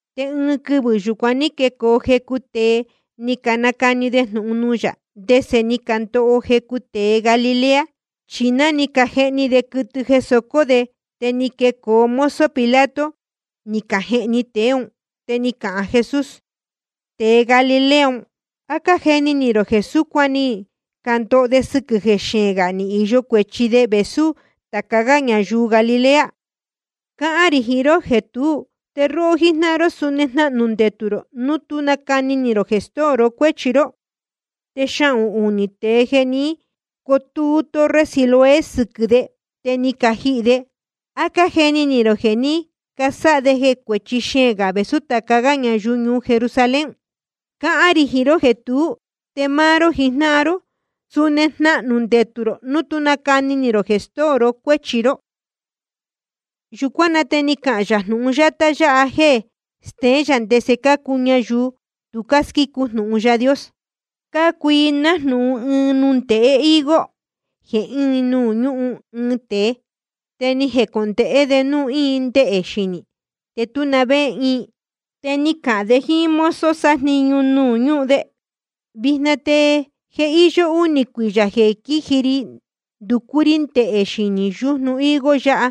Te ɨɨn quɨvɨ̄ yúcuan ní quecoo jecu tēe, ni canacani de jnūhun nuū yā ndese ni candoho jecu tēe Galilea. Chi ná cájehni de quɨtɨ jeē socó de, te ni quecoo mozo Pilato ni cajehni tēe ún. Te ni cahān Jesús: Tēe Galilea un, ¿á cájeni ni rō jeē súcuan ni candoho de sɨquɨ̄ jeē xeēn gā ni īyo cuēchi de vēsú tāca gá ñayuu Galilea? Cáhán rī jiín ró jeē tuú. Te róhó jíjnáhan ró suni jnahnū ndetū rō núu tú nacani ni rō jeē stóo ró cuéchi ró. Te xahūn unī tēe jeē ní cotúú torre Siloé sɨquɨ̄ de, te ni cajihī de, ¿á cájeni ni rō jeē ní casáha de cuēchi xeēn gā vēsú tāca gá ñayuu ñuu Jerusalén? Cáhán rī jiín ró jeē tuú. Te máá ró jijnáhan ró, suni jnahnū ndetū rō núu tú nacani ni rō jeē stóo ró cuéchi ró. Yūcuán na te ni cahān yā jnūhun yátá yáha jéē steén yā ndese cácuu ñayuu tu squícu jnūhun Yaā Dios: Cácuu i nájnūhun ɨɨn nundēhe higo jeē íin nuū ñúhun ɨɨn tēe. Te ni jecondēhé de núu íin ndehē xinī, te tú na vé íin. Te ni cahān de jíín mozo sájniñu nuū ñúhun de: Vijna te je íyó únī cuiyā jeē quíji ri nducú rí ndehē xinī yújnu higo yáha,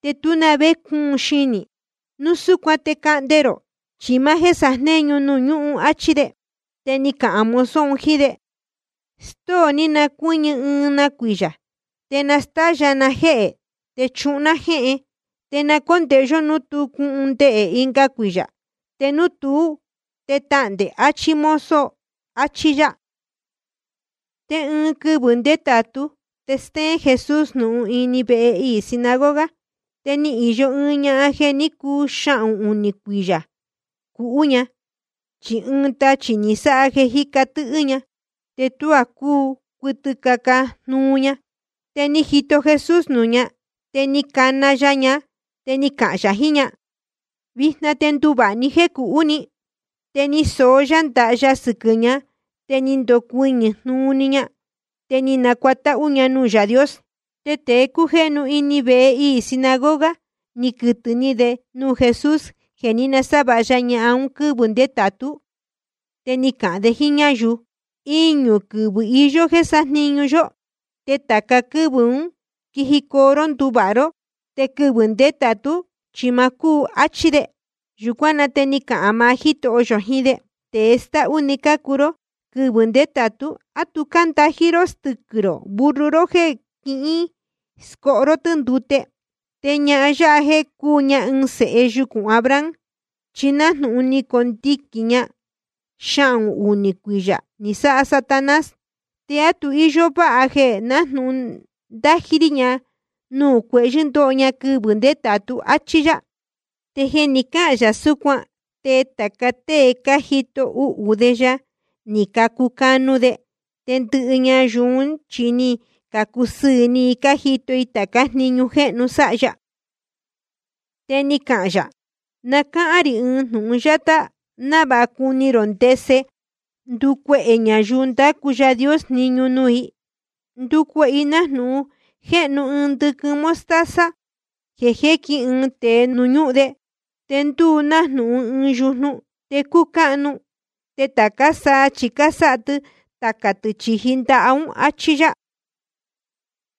te tú na vé cúun xinī. Núu súcuan te cahnde rō, chi máá jéē sajnéñu nuū ñúhun, áchí de. Te ni cahān mozo un jíín de: Stóo ní na cuɨ́ñɨ ɨɨn na cuiyā, te na nástáyā ná jéhē te chuhun ná jéhen. Te na cóndēhe yó núu tú cuun ndehē ɨnga cuiyā. Te núu tuú, te tahndē, achí mozo. Achí yá. Te ɨɨn quɨvɨ̄ ndétātú te stéén Jesús jnūhun ini vehe iī sinagoga. Te íyó ɨɨn ñahan jeē ní cuu xahūn unī cuiyā cuhú ña. Chi ɨɨn tachī ni sáha jeē jíca tɨ́hɨ́ ña, te tuá cúu cuɨtɨ caca jnuu ña. Te ni jito Jesús nuū ña, te ni cana ya ña, te ni cahān yā jiín ña: Vijna te nduvāha ní jéē cuhú ni. Te ni soó yá ndaha ya sɨquɨ̄ ña, te ni nucuɨñɨ̄ jnuu‑ni ña, te ni nacuatáhú ña nuū Yaā Dios. Te tēe cújéhnu ini vehe iī sinagoga, ni quɨtɨ̄ ni de nuū Jesús jeē ní nasávāha ya ñahan un quɨ́vɨ̄ ndétātú. Te ni cahān de jíín ñáyuu: Iñū quɨvɨ̄ iyó jéē sájniñu yó, te tāca quɨ́vɨ̄ ún quijicoo ró nduvāha ró. Te quɨvɨ̄ ndétātú chi ma cúu, áchí de. Yūcuán na te ni cahān maá Jítoho yō jiín de: Tēe stáhú‑ni cácuu ró. Quɨvɨ̄ ndétātu ¿á tu cándají ró stɨquɨ̄ rō burro ró jéē quíscóho ró tɨ́ ndute? Te ñahan yáha jéē cúu ña ɨɨn sēhe yucūn Abraham, chi nájnūhun ni conuhnī ña xahūn unī cuiyā ni sáha Satanás. ¿Te á tu íyó váha jeē nájnūhun nandají rí ña nuū cuehyɨ̄ ndóho ña quɨvɨ̄ ndétātú? Achí yá. Te jeē ni cáhān yā súcuan, te tāca tée cájito uhū de ya, ni cacucanu de. Te ndɨhɨ ñayuu ún chi ni cacusɨɨ̄ ni i jíto i tācá jniñu jéhnu sáha ya. Te ni cahān yā: Na cáhán rī ɨɨn jnūhun yátá návāha cuni rō ndese ndúcuehē ñayuu ndácu Yaā Dios jniñu nuū. Ndúcuehē i nájnūhun jéhnu ɨɨn ndɨquɨn mostaza jeē jéquin ɨɨn tēe nuū ñúhun de, te ndúu nájnūhun ɨɨn yujnu. Te cúu cáhnu, te tācá saa chi cásáha tɨ tacā tɨ̄ chīji ndaha ún. Achí yá.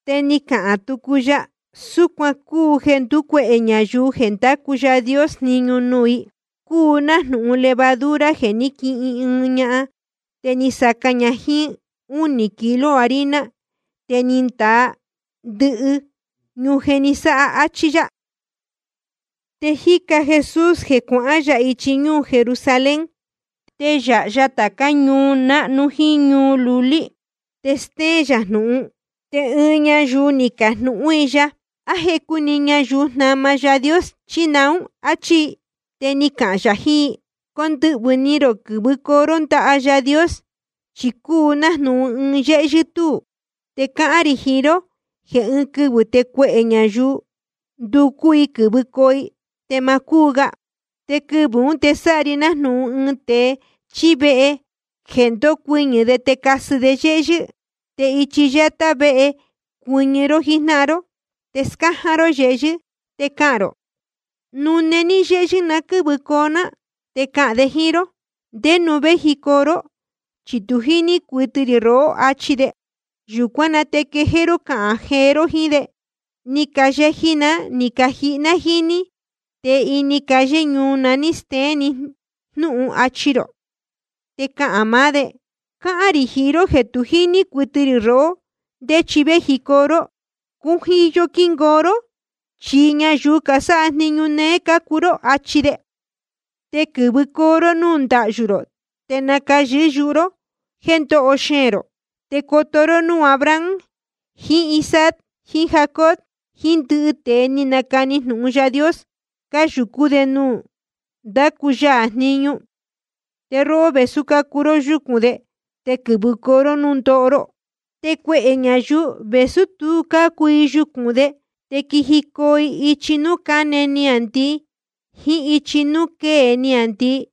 Te ni cahān tucu ya: Súcuan cúu jeē ndúcuehē ñayuu jeē ndácu Yaā Dios jniñu nuū: Cúu nájnūhun levadura jeē ní quihin ɨɨn ñahan, te ni saca ña jíín únī kilo harina, te ni ndaa ndɨhɨ ñujen ni sáha. Achí yá. Te jíca Jesús jeē cuahán yā ichi ñúū Jerusalén, te yáha ya tācá ñuu náhnu jíín ñuu lulí, te stéén yā jnūhun. Te ɨɨn ñayuu ni cajnūhún i ya: ¿A jecu‑ni ñayuu jnama Yaā Dios, chí naún? Achí i. Te ni cahān yā jiín i: Condɨhvɨ̄ ni rō quɨ̄vɨcoo ró ndaha Yaā Dios. Chi cúu nájnūhun ɨɨn yéhyɨ́ túū. Te cáhán rī jiín ró jeē ɨɨn quɨvɨ̄ te cuehē ñayuu nducú i quɨ̄vɨcoo i, te ma cúu ga. Te quɨvɨ̄ ún te sáha ri nájnūhun ɨɨn tēe chíí vehe jeē ndocuɨñɨ̄ de te nacasɨ de yéhyɨ́. Te ichi yátá véhe cuɨñɨ ró jíjnáhan ró, te scáján ró yehyɨ́, te cahān rō: Nune ní yéhyɨ́ na quɨ́vɨcoo ná. Te cahān de jíín ró: ¿Ndé nuū véjicoo ró? Chi tu jíní rī rohó, achi de. Yūcuán na te quejéé ró cahān rō jiín de: Ni cayeji ná ni cajihi ná jíín ní, te ini calle ñuu na ní steén ni jnúhun, achi rō. Te cahān maá de: Cáhán rī jiín ró jeē tu jíní rī rohó ndé chi véjicoo ró. Cujiyo quingoo ró, chi ñayuu casáha jniñu néé cácuu ró. Achi de. Te quɨ̄vɨcoo ró núū ndahyú rō, te nacayɨ̄hɨ́ yuhu ró jéē ndoho xeēn rō. Te coto ró núū Abraham jiín Isaac jiín Jacob jiín ndɨhɨ tēe ni canacani jnūhun Yaā Dios, cáyūcú de ñuu nuū ndácu ya jniñu. Te róhó, vēsú cácuu ró yúcūn de, te quɨ̄vɨcoo ró núū ndoho ró. Te cuehē ñayuu, vēsú tu cácuu i yucūn de, te quijicoo i ichi núū cáne niāndii jíín ichi núū quée niāndii,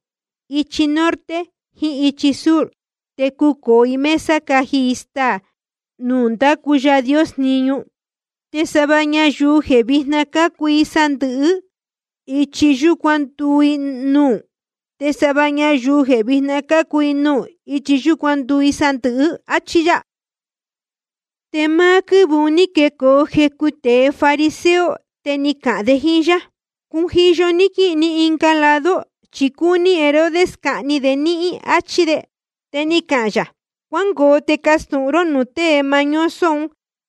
ichi norte jiín ichi sur. Te cucōo i mesa caji i staā ñuu nuū ndácu Yaā Dios jniñu. Te sava ñayuu jeē vijna cácuu i sandɨ̄hɨ́, ichi yúcuan nduu i nuū. Te sava ñayuu jeē vijna cácuu i nuū, ichi yúcuan nduu i sandɨ̄hɨ́. Achí yá. Te máá quɨ́vɨ̄ un ní quecoo jecu tēe fariseo, te ni cacahān de jíín yá: Cujiyo ní quíhīn ní ɨnga lado, chi cúní Herodes cahni de níhín, áchí de. Te ni cahān yā: Cuángoo te castūhun ró nuū tēe mañoso un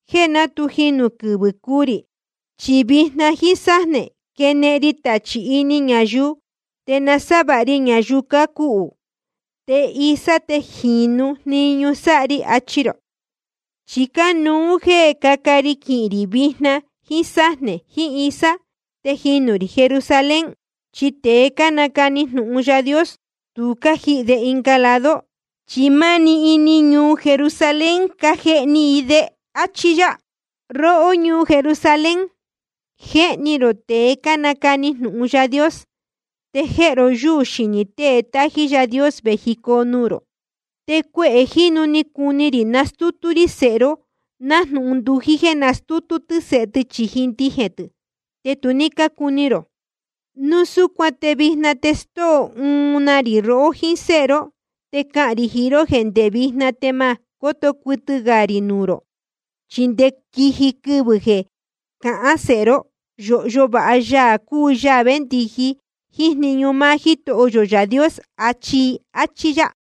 jéē ná tu jinū quɨvɨ̄ cuu rī, chi vijna jíín sájnē quenehen ri tachī ini ñayuu, te nasávāha ri ñayuu cácuhū. Te isá te jīnu jniñu sáha ri, achi rō. Chi cánuú jéē cáca ri quihīn rī vijna jíín sájnē jiín isá, te jinū rī Jerusalén. Chi tēe cánacani jnūhun Yaā Dios, tu cájihī de ɨnga lado, chi máá‑ni ini ñuu Jerusalén cájehni i de. Achí yá. ’Róhó ñuu Jerusalén, jéhni rō tēe cánacani jnūhun Yaā Dios, te jéhe ró yúū xinī tée tájí Yaā Dios vējicoo nuū rō. Te cuehē jínu ni cuni rī nastútú rí sēhe ró, nájnūhun ndují jéē nastútú tɨ́ sēhe tɨ chīji ndijēn tɨ̄, te tu ní cúní rō. Núu súcuan te vijna te stóo uun na ri rohó jíín séhe ró. Te cáhán rī jiín ró jéē ndé vijna te ma cóto cuɨtɨ gā rō nuū rī, chi nde quiji quɨvɨ̄ jeē cahán sēhe ró: Yōhyo vāha Yaā cúu Yaā véndiji jíín jniñu máá Jítoho yō Yaā Dios, achi i. Achí yá.